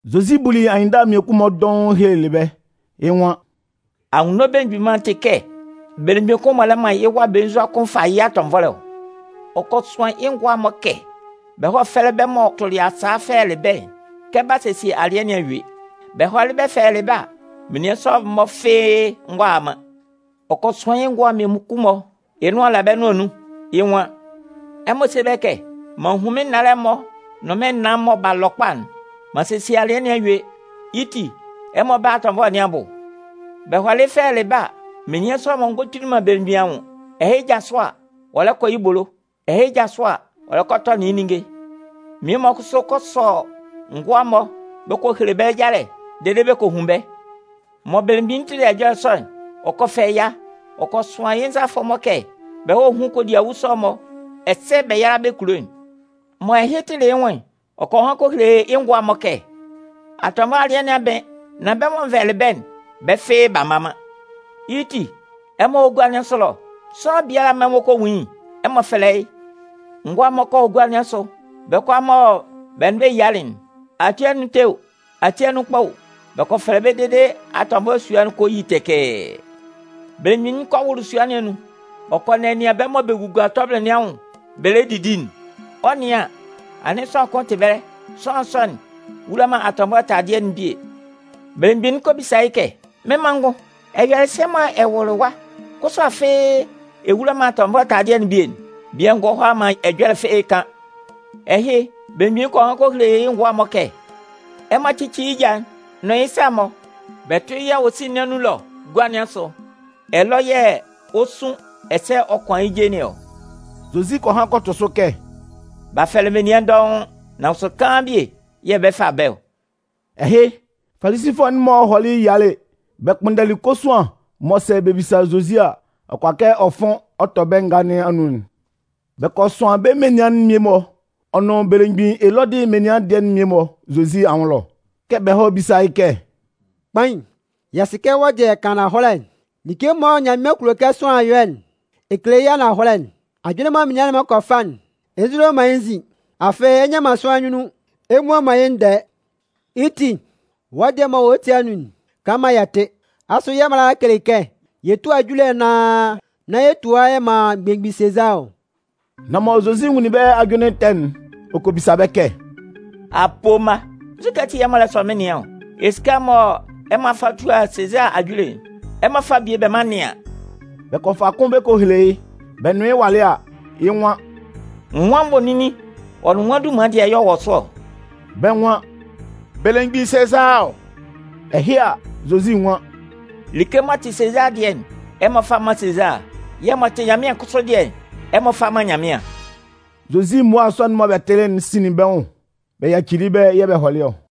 Zozi buli anyɩnndala mmiekun-mɔ dɔʋn ɔ helelɩ bɛ́. Yɩ́ nwan: “Anwunno Belemgbin Mân'n tɩ kɛ belemgbin kʋn m'ɔ lɛ man yɩ́ wa belenzua kʋn fa yɩ́ yɩ atɔnvɔlɛ ɔ. Ɔ kɔ sʋan yɩ́ ngʋa'n-mɔ kɛ bɛ hɔ́ fɛ́lɛ bɛ́ m'ɔ tʋlɩ yɩ́ sa fɛlɛlɩ bɛ́'n kɛ b'a sesie alɩɛ nɩn a yue. Bɛ hɔlɩ fɛlɛlɩ bɛ́ a, menian sɔ'n-mɔ fɩ́ɩ́ ngɔ a man. “Ɔ kɔ sʋan yɩ́ ngʋa'n mmiekun-mɔ, yɩ́ nʋan la bɛ́ nʋan nun, yɩ́ nwan: ‘Ɛmɔ sé bɛ́ kɛ: M'an hun mɩ́n nnalɛ'n-mɔ nʋn naan'n-mɔ mɔ b'a lɔ kpa'n. M'an sesie alɩɛ nɩn a yue. Yɩ́ ti, ɛmɔ bála atɔnvɔlɛ nɩn abʋ.’ “Bɛ hɔlɩ fɛlɛlɩ bɛ́ a, menian sɔ'n-mɔ ngɔ kpinlin belemgbin anwʋn. Ɛhɩ jasʋ a, ɔ lɛ kɔ yɩ́ ebolo, ɛhɩ jasʋ a, ɔ lɛ kɔ a tɔnɩn yɩ́ ninnge. Mmie-mɔ kʋsʋ kɔ sɔ ngʋa'n-mɔ bɛ kɔ hele bɛ́ yalɛ dede bɛ kɔ hun bɛ́. Mɔ belemgbin'n tɩlɩ ɛjɔlɛ sɔ'n, ɔ kɔ fɛ ɛya. Ɔ kɔ sʋan yɩ́ nzalafʋ'n-mɔ kɛ bɛ hɔ́ hún kodiawu sɔ'n-mɔ ɛsɛ bɛ yála bɛ́ kulo'n. “Mɔ ɛhɩ tɩlɩ yɩ́ nwʋn'n, ɔ kɔ han kɔ hele yɩ́ ngʋa'n-mɔ kɛ: ‘Atɔnvɔlɛ alɩɛ nɩn a bɩn. Nan bɛ́ mɔ n vɛlɛlɩ bɛ́'n, bɛ́ fɩ́ɩ́ b'a mma man. Yɩ́ ti, ɛmɔ hɔ́ gua nɩn asʋ ɛlɔ, sʋanlan biala mɔ ɛmɔ kɔ nwun yɩ́'n, ɛmɔ fɛ́lɛ yɩ́.’ Ngʋa'n-mɔ kɔ hɔ gua nɩn asʋ. Bɛ́ kʋalaa mɔ bɛ nʋn bɛ́ yialɩ'n, ati anun ɛtɛ o, ati anun kpa o, bɛ kɔ fɛlɛ bɛ́ dede atɔnvɔlɛ sua'n kɔ yi tɛkɛɛ. “Belemgbin'n kɔ wʋlʋ sua nɩn anun, ɔ kɔ nɛnɩan bɛ́ mɔ bɛ gugua tɔbɩlɩ nɩn anwʋn bɛ lɛ didi'n. Ɔ 'nɩan an, anɩn sʋanlan kʋn tɩ ɛbɛlɛ. Sʋanlan sɔ'n wula man atɔnvɔlɛ taladɩɛ'n bie. Belemgbin'n kɔ bisa yɩ́ kɛ: ‘Mɩ́n manngʋn, ɛ yɔlɩ sɛ mɔ ɛ wʋlʋlɩ ɛwa, kʋsʋ afɩ ɛ wula man atɔnvɔlɛ taladɩɛ'n bie'n?’ Bian'n ngɔ hʋala man ɛjɔlɛ fɩ́ɩ́ kan. “Ɛhɩ, belemgbin'n kɔ han kɔ hele yɩ́ ngʋa'n-mɔ kɛ: ‘Ɛmɔ cɩ́cɩ yɩ́ ja'n nʋn yɩ́ sa'n-mɔ bɛ tʋ́ yɩ́ awosin nɩn anun ɛlɔ gua nɩn asʋ. Ɛlɔ yɛ̂ ɔ 'sun ɛsɛ ɔ 'kʋan yɩ́ je nɩn ɔ.’” Zozi kɔ han kɔ tʋ sʋ kɛ: “B'a fɛlɛ menian dɔʋn, nan kʋsʋ kaan bie yɛ̂ bɛ 'fa bɛ́ ɔ.” Ɛhɩ, Falisifʋɛ'n-mɔ hɔlɩ yialɩ bɛ kpʋnndɛlɩ kosuan mɔ sɛ bɛ bisa Zozi a, ɔ kʋala kɛ ɔ fʋn ɔ tɔ bɛ́ ngaa nɩn anun'n. Bɛ kɔ sʋan bɛ́ menian'n mmie-mɔ, ɔ nʋn belemgbin Elɔdɩ menian dɩɛ'n mmie-mɔ Zozi anwʋn ɛlɔ, kɛ bɛ hɔ́ bisa yɩ́ kɛ: “Kpain, yɛ sɩ kɛ wɔ́ dɩɛ ɛ kan ananhɔlɛ. Like mɔ Nyanmɩan kulo kɛ sʋanlan yɔ'n, ɛ kele yɩ́ ananhɔlɛ. Ajʋnlɩn mɔ menian'n-mɔ kɔ fa'n, ɛ nzulo man yɩ́ nzin. Afɩ ɛ nnɩan man sʋanlan nyunnun ɛ mmua man yɩ́ ndɛɛ. Yɩ́ ti, wɔ́ dɩɛ m'ɔ wɔ wɔ́ ti anun'n, kan maan yɛ tɩ́. Asʋ yɛ́ mala'n kele kɛ yɛ túa ajule anaan nán yɛ tua yɛ man belemgbin Sezaa ɔ?” Nan mɔ Zozi nwunlin bɛ́ ajʋnlɩn ɛtɛ'n, ɔ kɔ bisa bɛ́ kɛ: “Apoo mma, nzukɛ ati yɛ̂ ɛmɔ lɛ sɔ mɩ́n nɩan ɔ? Esika'n mɔ ɛmɔ fa tua Sezaa ajule'n, ɛmɔ fá bie bɛ mán n nɩ́an.” Bɛ kɔ fa kʋn bɛ kɔ bɛlɛ yɩ́. Bɛ nʋn yɩ́ walɩ a, yɩ́ nwan: “Nwan nvoninnin ɔ nʋn nwan dunman dɩɛ yɛ̂ ɔ wɔ sʋ ɔ?” Bɛ́ nwan: “Belemgbin Sezaa ɔ.” Ɛhɩ a, Zozi nwan: “Like m'ɔ tɩ́ Sezaa dɩɛ'n, ɛmɔ fá mán Sezaa yɛ̂ m'ɔ tɩ Nyanmɩan kʋsʋ dɩɛ'n, ɛmɔ fá mán Nyanmɩan.” Zozi mmua sɔ'n mɔ bɛ tɩlɩ'n sinlin bɛ́ nwʋn. Bɛ yacili yɩ́ ɛbɛlɛ yɛ̂ bɛ hɔlɩ ɔ.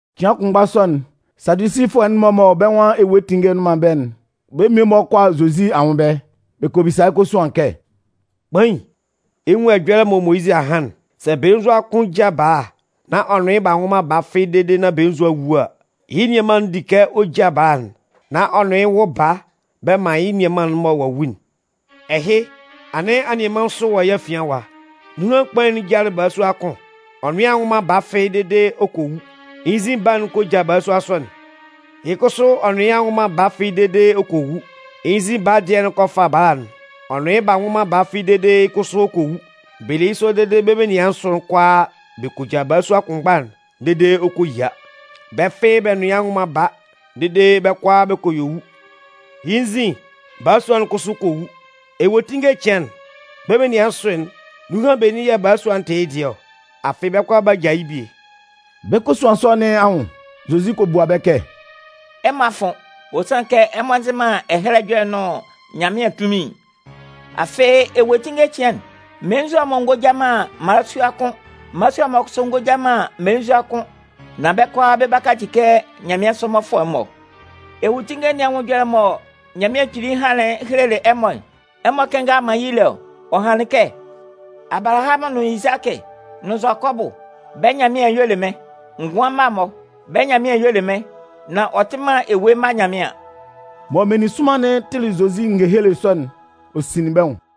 Cɩan kʋnmgba sɔ'n, Sadusifʋɛ'n-mɔ mɔ bɛ́ nwan ewuetinnge nnʋn man ɛbɛlɛ'n, bɛ́ mmie-mɔ kɔ a Zozi anwʋn ɛbɛlɛ. Bɛ kɔ bisa yɩ́ kosuan kɛ: “Kpain, ɛ 'nwun ɛjɔlɛ mɔ Moyizɩ a han'n: ‘Sɛ belenzua kʋn ja bala nán ɔ nʋn yɩ́ b'a nwʋ man baa fɩ́ɩ́ dede nán belenzua'n wu a, yɩ́ nianman'n di kɛ ɔ ja bala'n, nán ɔ nʋn yɩ́ wʋ baa bɛ man yɩ́ nianman'n mɔ ɔ'a wu'n.’ Ɛhɩ, anɩn anianman nsʋ wɔ yɛ́ afian ɛwa. Nunhan kpain'n jalɩ balasua kʋn, ɔ nʋn yɩ́ a nwʋ man baa fɩ́ɩ́ dede ɔ kɔ wu. Yɩ́ nzin baa'n kɔ ja balasua sɔ'n. Yɩ́ kʋsʋ ɔ nʋn yɩ́ b'a nwʋ man baa fɩ́ɩ́ dede ɔ kɔ wu, yɩ́ nzin baa dɩɛ'n kɔ fa bala'n. Ɔ nʋn yɩ́ b'a nwʋ man baa fɩ́ɩ́ dede yɩ́ kʋsʋ ɔ kɔ wu. Bɛ le yɩ́ sɔ dede bɛ́ menian nsʋ'n kʋalaa bɛ kɔ ja balasua kʋnmgba'n dede ɔ kɔ yia. Bɛ́ fɩ́ɩ́ bɛ nʋn yɩ́ a nwʋ man baa dede bɛ́ kʋalaa bɛ́ kɔ yue wu. Yɩ́ nzin, balasua'n kʋsʋ kɔ wu. Ewuetinnge cɩan'n, bɛ́ menian nsʋ'n, nunhan benin yɛ̂ balasua'n tɩ yɩ́ dɩɛ ɔ? Afɩ bɛ́ kʋalaa b'a ja yɩ́ bie.” Bɛ́ kosuan sɔ nɩn anwʋn, Zozi kɔ bua bɛ́ kɛ: “Ɛmɔ a fʋn, ɔ sanlɩn kɛ ɛmɔ nzɩ man Ɛhɛlɛ Ɛjɔlɛ'n nʋn Nyanmɩan tunmin'n. Afɩ ewuetinnge cɩan'n, mmelenzua'n-mɔ ngɔ ja man mmalasua kʋ́n, mmalasua'n-mɔ kʋsʋ ngɔ ja man mmelenzua kʋ́n. Nan bɛ́ kʋalaa bɛ 'kaci kɛ nyanmɩansʋ mmɔfʋɛ'n-mɔ. Ewuetinnge nɩn anwʋn ɛjɔlɛ'n mɔ Nyanmɩan Kpili hanlɩn helelɩ ɛmɔ'n, ɛmɔ kɩnngalɩ man yɩ́ lé ɔ? Ɔ hanlɩn kɛ: Abalahamʋn nʋn Izakɩ nʋn Zʋakɔbʋ, bɛ́ Nyanmɩan'n y'ɔ le mɩ́n. Ngʋan mma'n-mɔ, bɛ́ Nyanmɩan'n y'ɔ le yɩ́, nan ɔ tɩ man ewue mma Nyanmɩan.” Mɔ meninsʋnman'n tɩlɩ Zozi ngehele sɔ'n, ɔ sinlin bɛ́ nwʋn.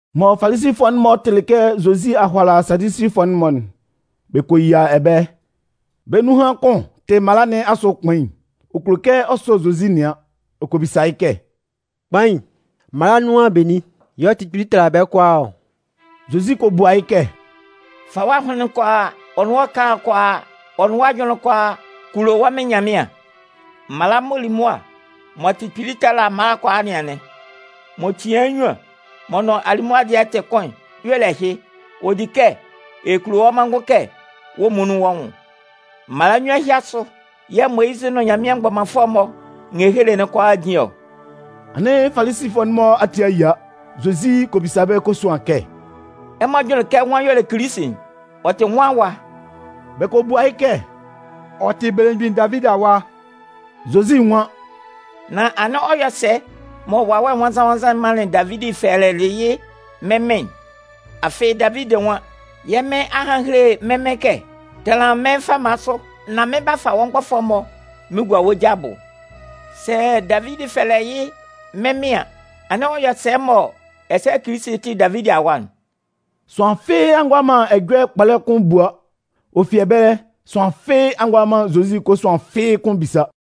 Mɔ Falisifʋɛ'n-mɔ tɩlɩ kɛ Zozi a hʋala Sadusifʋɛ'n-mɔ'n, bɛ kɔ yia ɛbɛlɛ. Bɛ́ nunhan kʋn tɩ mala nɩn asʋ kpain. Ɔ kulo kɛ ɔ sɔ Zozi nɩan. Ɔ kɔ bisa yɩ́ kɛ: “Kpain, mala'n nunhan benin y'ɔ tɩ kpili tala bɛ́ kʋalaa ɔ?” Zozi kɔ bua yɩ́ kɛ: “Fa wɔ́ ahʋnlɩn'n kʋalaa, ɔ nʋn wɔ́ ɛkala'n kʋalaa, ɔ nʋn wɔ́ ajʋnlɩn'n kʋalaa kulo wɔ́ Mɩn Nyanmɩan. Mala m'ɔ li mʋa m'ɔ tɩ kpili tala bɛ́ kʋalaa nɩn anɩn. M'ɔ tian yɩ́ nnyuan, m'ɔ nʋn alimʋa dɩɛ'n tɩ kʋn'n, y'ɔ le ɛhɩ: Ɔ di kɛ ɛ kulo wɔ́ manngʋn kɛ wɔ́ muonun wɔ́ nwʋn. Mala nnyuan ɛhɩ asʋ yɛ̂ Moyizɩ nʋn Nyanmɩan mgbɔmanfʋɛ'n-mɔ ngehele'n kʋalaa jin ɔ.” Anɩn Falisifʋɛ'n-mɔ ati a yia. Zozi kɔ bisa bɛ́ kosuan kɛ: “Ɛmɔ jʋnlɩn kɛ nwan y'ɔ le Kilisi'n? Ɔ tɩ nwan awa?” Bɛ kɔ bua yɩ́ kɛ: “Ɔ tɩ belemgbin Davidi awa.” Zozi nwan: “Nan anɩn ɔ yɔ sɛ mɔ Wawɛ Nwannzan-nwannzan'n manlɩn Davidi fɛlɛlɩ yɩ́ ‘mɩ́n Mɩn'n’? Afɩ Davidi nwan: Yɛ́ Mɩn a han a hele mɩ́n Mɩn kɛ: Tanlan mɩ́n fama sʋ, nán mɩn 'ba fa wɔ́ mgbɔfʋɛ'n-mɔ mɩn gua wɔ́ ja abʋ. Sɛ Davidi fɛlɛ yɩ́ ‘mɩ́n Mɩn’ an, anɩn ɔ yɔ sɛ mɔ ɛsɛ Kilisi'n tɩ Davidi awa'n?” Sʋanlan fɩ́ɩ́ a ngʋala man ɛjɔlɛ kpɔlɛ kʋn bua. Ɔ fi ɛbɛlɛ, sʋanlan fɩ́ɩ́ a ngʋala man Zozi kosuan fɩ́ɩ́ kʋ́n bisa.